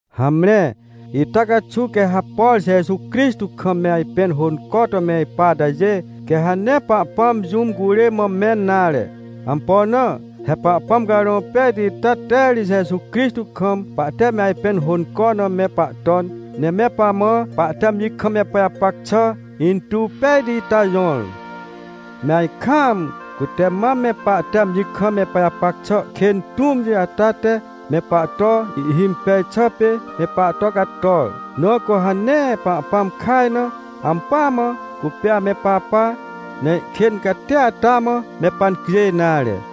Hamre, ita caxuw quê ha, por Jeju Crixtô kam me ajpẽn hônco to me ipa atajê, quê ha nee Pahpãm jũm curê mã mẽn nare. Ampo na? He Pahpãm Carõ Pejti ita te ri Jeju Crixtô kam pahte me ajpẽn hônco na me pahton, ne me pamã pahte amji kam me pajapac xà intuw pejti ita jõr. Me ajkaam, cute mam me pahte amji kam me pajapac xà kên tũmti ata te, me pahto ihhimpej xà pê me pahto cator. Na cu ha nee Pahpãm kaj na, ampỳa mã cupê ame papa, ne ihkên catia ata mã me pancjêj nare.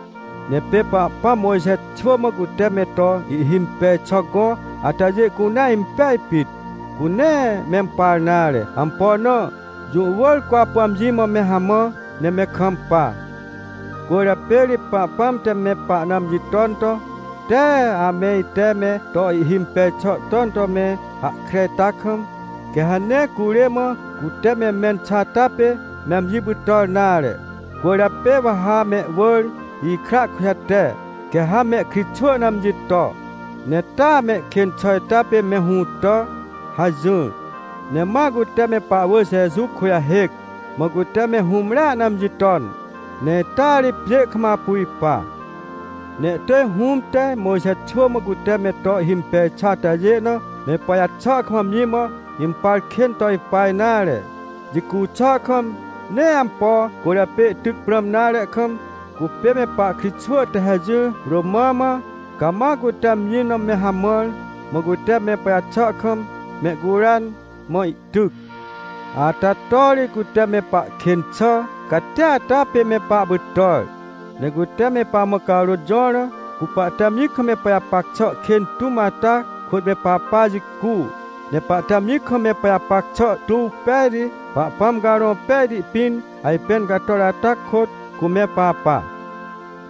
Ne pê Pahpãm Mojxe xwỳ mã cute me to ihhimpej xà gõ atajê cunea impej pit. Cu nee mempar nare. Ampo na? Jũ wỳr cu apu amji mã me hamã, ne me kampa. Cwỳrjapê ri Pahpãm te me pahna amji ton to: — Tee ame ite me to ihimpej xà ton to me hahkre ita kam, quê ha nee curê mã cute me mẽn xà ata pê me amji pytàr nare. Cwỳrjapê wa ha mehwỳr ikra kujate, quê ha mehkritxwỳ na amji to, ne taa mehkên xà ita pê me hũtà — hajỹr. Ne ma cute me pahwỳr Jeju kujahêc, mã cute me hũmrea na amji ton, ne ita ri pjê kam apu ipa. Ne ihtỳj Hũm te, Mojxe xwỳ mã cute me to ihhimpej xà atajê na, me pajaxà kam amji mã impar kên to ipa nare. Jicu xà kam, nee ampo cwỳrjapê ihtyc prãm nare kam, cupê me pahkritxwỳ te hajỹr romã mã, cama cute amji na me hamãr, mã cute me pajaxà kam mehcuran, mã ihtyc. Ata to ri cute me pahkên xà catia ata pê me pahpytàr. Ne cute me pamã carôt jõr na, cu pahte amji kam me pajapac xà kên tũm ata kôt me papa jicu, ne pahte amji kam me pajapac xà tuw pejti, Pahpãm Carõ Pejti pĩn ajpên cator ata kôt, cu me papa.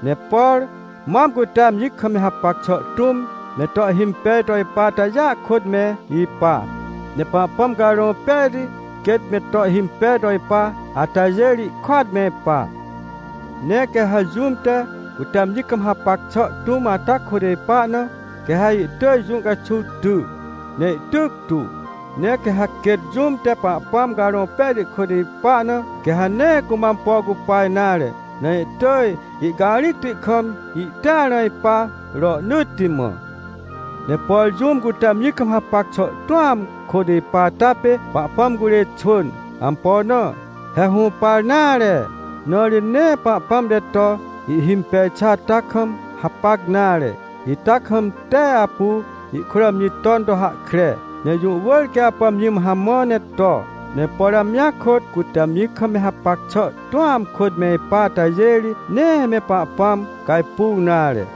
Ne por mam cute amji kam hapac xà tũm me to ihhimpej to ipa atajêa kôt me ipa. Ne Pahpãm Carõ Pejti quêt me to ihhimpej to ipa atajê ri, ihkôat me ipa. Ne quê ha jũm te, cute amji kam hapac xà tũm ata kôt ipa na, quê ha ihtỳj jũ caxuw ty, ne ihtyc tu. Ne quê ha quêt jũm te Pahpãm Carõ Pejti kôt ipa na, quê ha nee cumã ampo cupa nare, ne ihtỳj ihcarĩcti kam, ihtĩar na ipa rohnỳtti mã. Ne por jũm cute amji kam hapac xà tũam kôt ipa ata pê Pahpãm curê xwỳn. Ampo na? He hũpar nare, na ri nee Pahpãm te to ihhimpej xà ata kam hapac nare. Ita kam tee apu ihkôt amji ton to hahkre, ne jũ wỳr quê apu amji mã hamã ne to. Ne por amjia kôt cute amji kam me hapac xà tũam kôt me ipa atajê ri, nee me Pahpãm cajpuaw nare.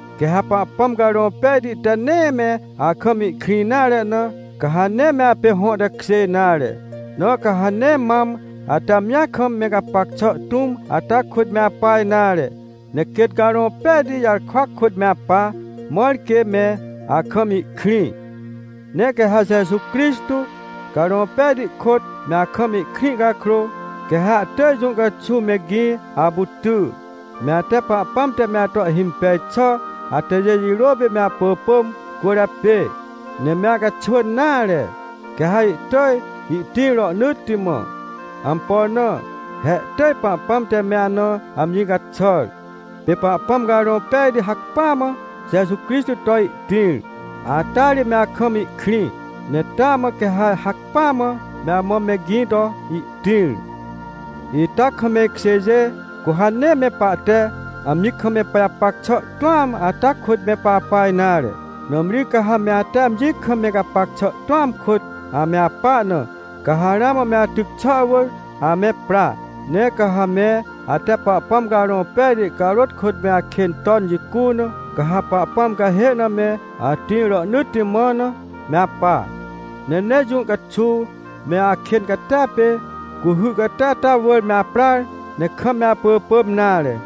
Quê ha Pahpãm Carõ Pejti te nee me akam ihkrĩ nare na, ca ha nee me apê hõ tekjê nare. Na ca ha nee mam, ate amji kam me gapac xà tũm ata kôt me apa nare, ne quêt Carõ Pejti jarkwa kôt me apa, mãr quê me akam ihkrĩ. Ne quê ha Jeju Crixtô, Carõ Pejti kôt, me akam ihkrĩ cakrô, quê ha ihtỳj jũ caxuw me gĩ apu ty, me ate Pahpãm te me ato ihhimpej xà atajê jirô pê me apỳpỳm cwỳrjapê. Ne me acaxwỳn nare, quê ha ihtỳj ihtĩr rohnỳtti mã. Ampo na? He ihtỳj Pahpãm te me ana amji caxàr. Pê Pahpãm Carõ Pejti hacpỹa mã Jeju Crixtô to ihtĩr, ata ri me akam ihkrĩ. Ne taa mã quê ha hacpỹa mã, me amã me gĩ to ihtĩr. Ita kam me ikjêjê, cu ha nee me pahte amji kam me pajapac xà tũam ata kôt me papa nare. Nãmri ca ha me ate amji kam me gapac xà tũam kôt ame apa na, ca ha ramã me atyc xà wỳr ame pra. Ne ca ha me ate Pahpãm Carõ Pejti carôt kôt me akên ton jicu na, ca ha Pahpãm cahê na me atĩr rohnỳtti mã na, me apa. Ne nee jũ caxuw me akên catia pê, cuhy cati ata wỳr me aprar, ne kam me apỳpỳm nare.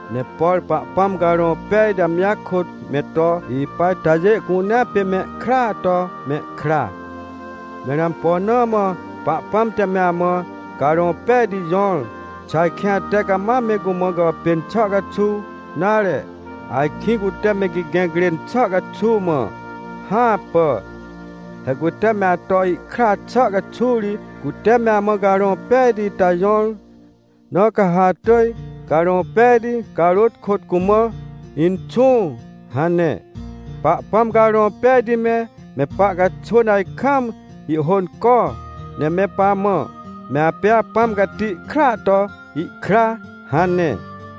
Ne por Pahpãm Carõ Pejti amji kôt me to ipa atajê cunea pê mehkraa to mehkra. Mẽr ampo na mã Pahpãm te me amã Carõ Pejti jõr? Xà ajkĩ ate cama me cumã gàpên xà caxuw, nare, ajkĩ cute me gigẽc rên xà caxuw mã? Hãpà. He cute me ato ihkra xà caxuw ri, cute me amã Carõ Pejti ita jõr. Na ca ha atỳj Carõ Pejti carôt kôt cumã: — Inxũ — hane. Pahpãm Carõ Pejti me, me pahcaxwỳn ajkam ihhônco, ne me pamã: — Me apê Apãm Cati kraa to ihkra — hane.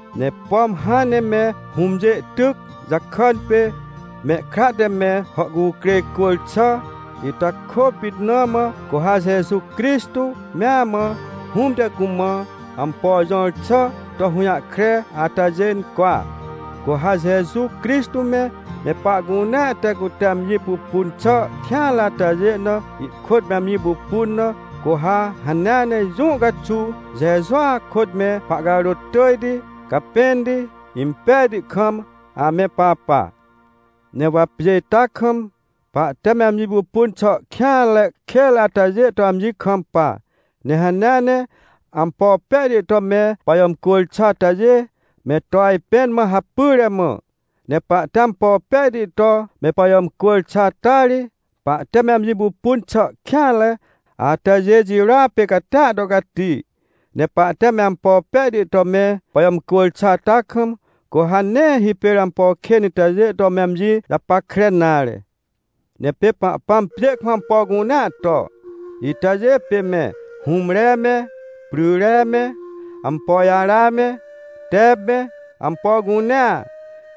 Ne pom hãn ne me hũmjê tyc jakàn pê, mehkra te me hàhcukrêj cwỳr xà, ita kôpit na mã, cu ha Jeju Crixtô mea mã, Hũm te cumã ampo jõr xà to hũjahkre atajê cwa. Cu ha Jeju Crixtô me, me pahcunea te cute amji pupun xà kêanre atajê na ihkôt me amji pupun na, cu ha hanea ne jũ caxuw, Jejua kôt me pahcarôt tỳjti, capẽnti, impejti kam ame papa. Ne wa pjê ita kam, pahte me amji pupun xà kêanre kênre atajê to amji kampa, ne hanea ne ampo pejti to me pajàmcwỳr xà atajê me to ajpẽn mã hapyre mã. Ne pahte ampo pejti to me pajàmcwỳr xà ata ri, pahte me amji pupun xà kêanre atajê jirôa pê catia to cati. Ne pahte me ampo pejti to me pajàmcwỳr xà ata kam, cu ha nee hipêr ampo kên itajê to me amji japackre nare. Ne pê Pahpãm pjê kam ampo cunea to, itajê pê me hũmre me, pryre me, ampo jara me, tep me, ampo cunea.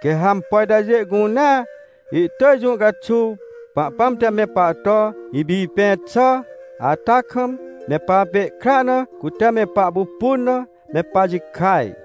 Quê ha ampo itajê cunea ihtỳj jũ caxuw, Pahpãm te me pahto ipipẽ xà ata kam, me papê ihkra na cute me pahpupun na, me pajikaj.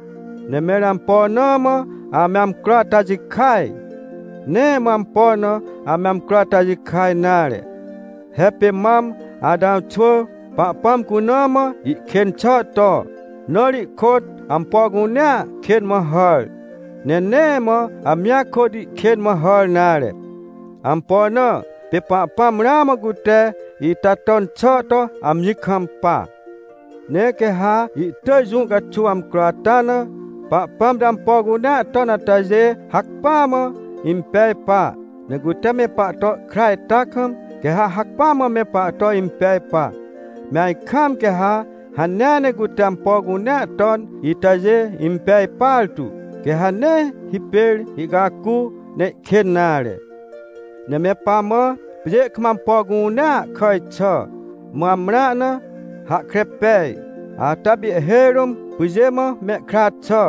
Ne mẽr ampo na mã ame amcro ata jikaj? Nee mã ampo na ame amcro ata jikaj nare. He pê mam Atãw xwỳ Pahpãm cuna mã ihkên xà to, na ri ihkôt ampo cunea kên mã hàr. Ne nee mã amjia kôt ihkên mã hàr nare. Ampo na? Pê Pahpãm ramã cute ita ton xà to amji kampa. Ne quê ha ihtỳj jũ caxuw amcro ata na, Pahpãm te ampo cunea ton atajê hacpỹa mã impej pa. Ne cute me pahto ihkra ita kam, quê ha hacpỹa mã me pahto impej pa. Me ajkaam, quê ha hanea ne cute ampo cunea ton itajê impej partu, quê ha nee hipêr ihcacu, ne ihkên nare. Ne me pamã, pjê kam ampo cunea kàj xà, mã amrã na, hahkre pej. Ata pê ihhêj rũm pyjê mã mehkra xà,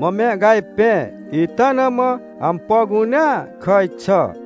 mã me ihcajpẽ ita na mã ampo cunea kàj xà.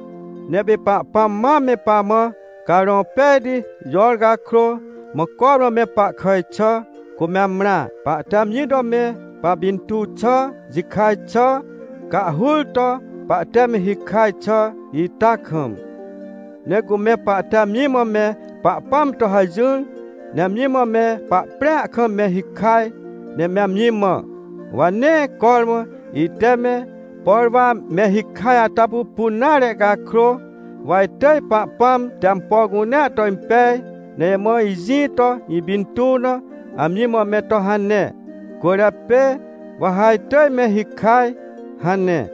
Ne pê Pahpãm mam me pamã Carõ Pejti jõr cakrô, mã cormã me pahkàj xà, cu me amrã, pahte amji to me papintuw xà jikaj xà cahhur to, pahte me hikaj xà ita kam. Ne cu me pahte amji mã me Pahpãm to hajỹr, ne amji mã me pahprĩa kam me hikaj, ne me amji mã: — Wa nee cormã ite me, por wa me hikaj ata pupun nare cakrô, wa itỳj Pahpãm te ampo cunea to impej, ne imã ijĩ to ipintuw na amji mã me to hane. Cwỳrjapê, wa ha itỳj me hikaj — hane.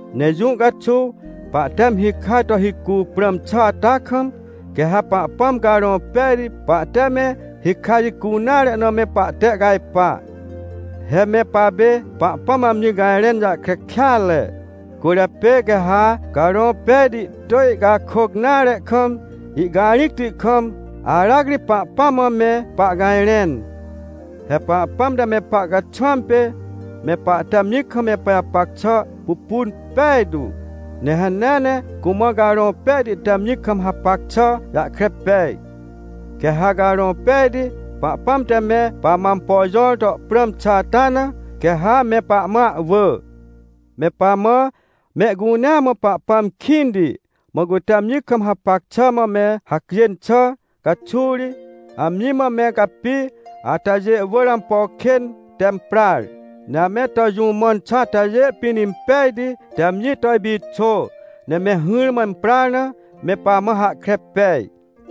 Ne jũ caxuw, pahte me hikaj to hicu prãm xà ata kam, quê ha Pahpãm Carõ Pejti pahte me hikaj jicu nare na me pahtehcajpa. He me papê Pahpãm mã amji cajrẽn jahkre kêatre, cwỳrjapê quê ha Carõ Pejti ihtỳj ihcakôc nare kam ihcarĩcti kam, aracri Pahpãm mã me pahcajrẽn. He Pahpãm te me pahcaxwãm pê me pahte amji kam me pajapac xà pupun pejtu. Ne hanea ne cumã Carõ Pejti te amji kam hapac xà jahkre pej. Quê ha Carõ Pejti Pahpãm te me pamã ampo jõr to prãm xà ata na, quê ha me pamã ahwỳ. Me pamã, mehcunea mã Pahpãm kĩnti, mã cute amji kam hapac xà mã me hacjên xà caxuw ri, amji mã me capi atajê wỳr ampo kên te imprar, ne ame to jũ mãn xà atajê pĩn impejti te amji to ipixô, ne me hỹrmã imprar na, me pamã hahkre pej.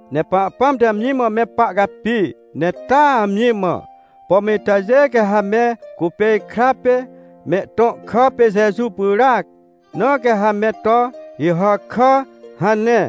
Ne Pahpãm te amji mã me pahcapi, ne taa amji mã: — Pom itajê quê ha me cupê ikra pê mehtõ kà pê Jeju pyràac, na quê ha me to “Ihàkà” — hane.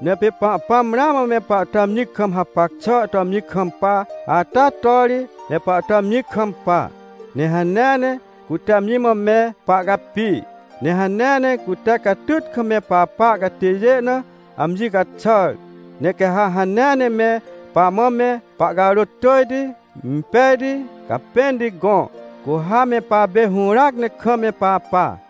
Ne pê Pahpãm ramã me pahto amji kam hapac xà to amji kampa ata to ri, me pahto amji kampa. Ne hanea ne cute amji mã me pahcapi. Ne hanea ne cute catyt kam me papa catêjê na amji caxàr, ne quê ha hanea ne me pamã me pahcarôt tỳjti, impejti, capẽnti gõ, cu ha me papê hũràac ne kam me papa.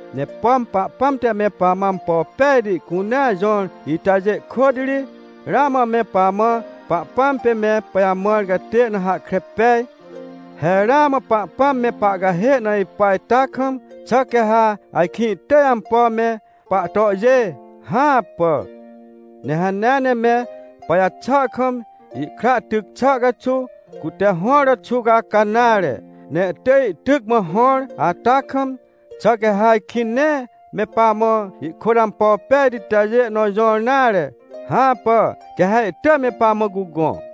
Ne pom Pahpãm te me pamã ampo pejti cunea jõr itajê kôt ri, ramã me pamã Pahpãm pê me pajamãr catê na hahkre pej. He ramã Pahpãm me pahcahê na ipa ita kam, xà quê ha ajkĩ ihtỳj ampo me pahtohjê? Hãpà! Ne hanea ne me pajaxà kam, ihkra tyc xà caxuw, cute hõr to xuwcaca nare, ne ihtỳj ihtyc mã hõr ata kam, xà quê ha ajkĩ nee me pamã ihkôt ampo pejti itajê nõ jõr nare? Hãpà, quê ha ihtỳj me pamã cugõ!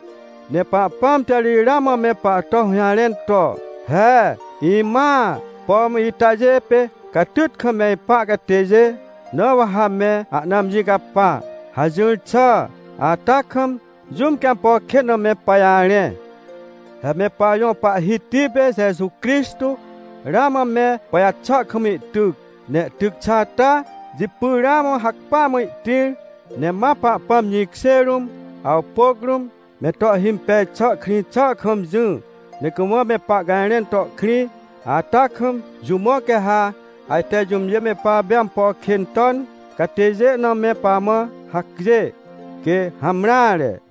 Ne Pahpãm te ri ramã me pahto hũjarẽn to: — He imãa, pom itajê pê catyt kam me ipa catêjê, na wa ha me ahna amji capa — hajỹr xà ata kam, jũm quê ampo kên na me pajarẽ? He me pajõ Pahhiti pê Jeju Crixtô ramã me pajaxà kam ihtyc, ne ihtyc xà ata jipy, ramã hacpỹa mã ihtĩr, ne ma Pahpãm jĩkjê rũm awpôc rũm, me to ihhimpej xà krĩ xà kam jỹ, ne cumã me pahcajrẽn to ihkrĩ. Ata kam, jũ mã quê ha ajte jũmjê me papê ampo kên ton catêjê na me pamã hacjê? Quê, hamreare!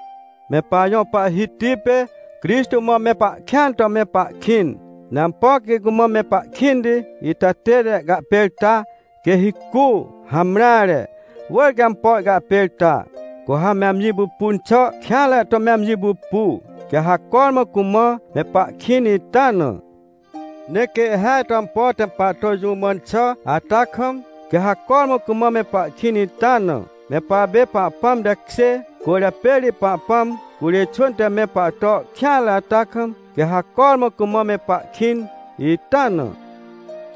Me pajõ Pahhiti pê Crixtô mã me pahkĩan to me pahkĩn. Ne ampo quê cumã me pahkĩnti ita tête ihcahpêrta, quê hicu? Hamreare, wỳr quê ampo ihcahpêrta! Cu ha me amji pupun xà kêanre to me amji pupu, quê ha cormã cumã me pahkĩn ita na. Ne quê ihhêaj to ampo te me pahto jũ mãn xà ata kam, quê ha cormã cumã me pahkĩn ita na. Me papê Pahpãm tekjê cwỳrjapê ri Pahpãm curê xwỳn te ame pahto kêanre ata kam, quê ha cormã cumã me pahkĩn ita na.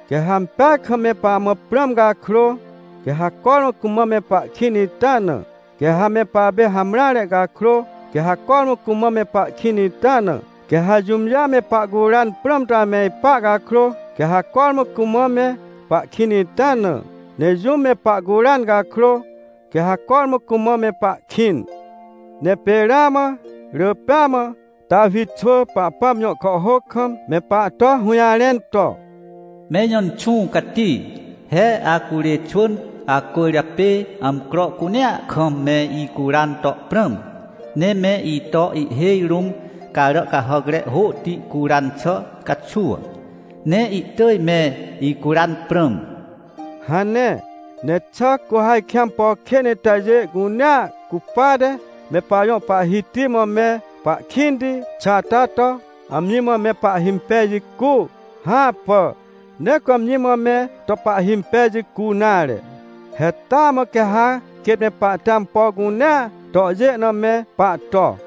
Quê ha ampeaj kam me pamã prãm cakrô, quê ha cormã cumã me pahkĩn ita na. Quê ha me papê hamreare cakrô, quê ha cormã cumã me pahkĩn ita na. Quê ha jũmjê ame pahcuran prãm to ame ipa cakrô, quê ha cormã cumã me pahkĩn ita na. Ne jũm me pahcuran cakrô, quê ha cormã cumã me pahkĩn. Ne pê ramã rỳ pêa mã Tawi xwỳ Pahpãm jõ kàhhôc kam me pahto hũjarẽn to: “Me ijõ Inxũ Cati, he acurê xwỳn acwỳrjapê amcro cunea kam me icuran to prãm. Ne me ito ihhêj rũm carà cahàcre hôhti curan xà caxuw, ne ihtỳj me icuran prãm” hane. Ne xà cu ha ajkĩ ampo kên itajê cunea cupate me pajõ Pahhiti mã me pahkĩnti xà ata to, amji mã me pahhimpej jicu? Hãpà, nee cu amji mã me to pahhimpej jicu nare! He taa mã quê ha quêt me pahte ampo cunea tohjê na me pahto!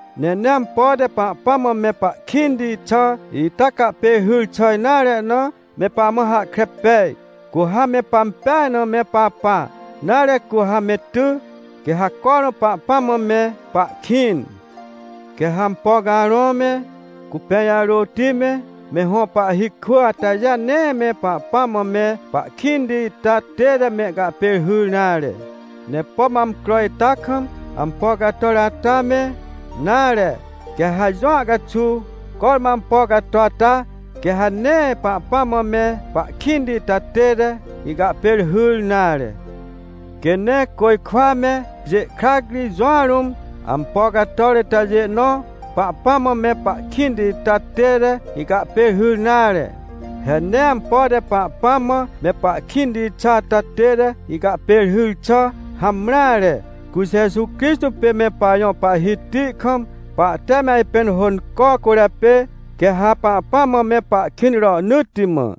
Ne nee ampo te Pahpãm mã me pahkĩnti xà ita cahpêrhyr xà nare na, me pamã hahkre pej. Cu ha me pampeaj na me papa, nare, cu ha me ty, quê ha cormã Pahpãm mã me pahkĩn. Quê ha ampo carõ me, cupẽ jarôti me, me hõ pahhi kwỳ atajê nee me Pahpãm mã me pahkĩnti ita tête mehcahpêrhyr nare. Ne pom amcro ita kam ampo cator ata me, nare, quê ha jũa caxuw, cormã ampo cato ata, quê ha nee Pahpãm mã me pahkĩnti ita tête ihcahpêrhyr nare. Quê nee côjkwa me pjê krac ri jũa rũm, ampo cator itajê nõ Pahpãm mã me pahkĩnti ita tête ihcahpêrhyr nare. He nee ampo te Pahpãm mã me pahkĩnti xà ata tête ihcahpêrhyr xà hamreare. Cu Jeju Crixtô pê me pajõ Pahhiti kam pahte me ajpẽn hônco cwỳrjapê, quê ha Pahpãm mã me pahkĩn rohnỳtti mã.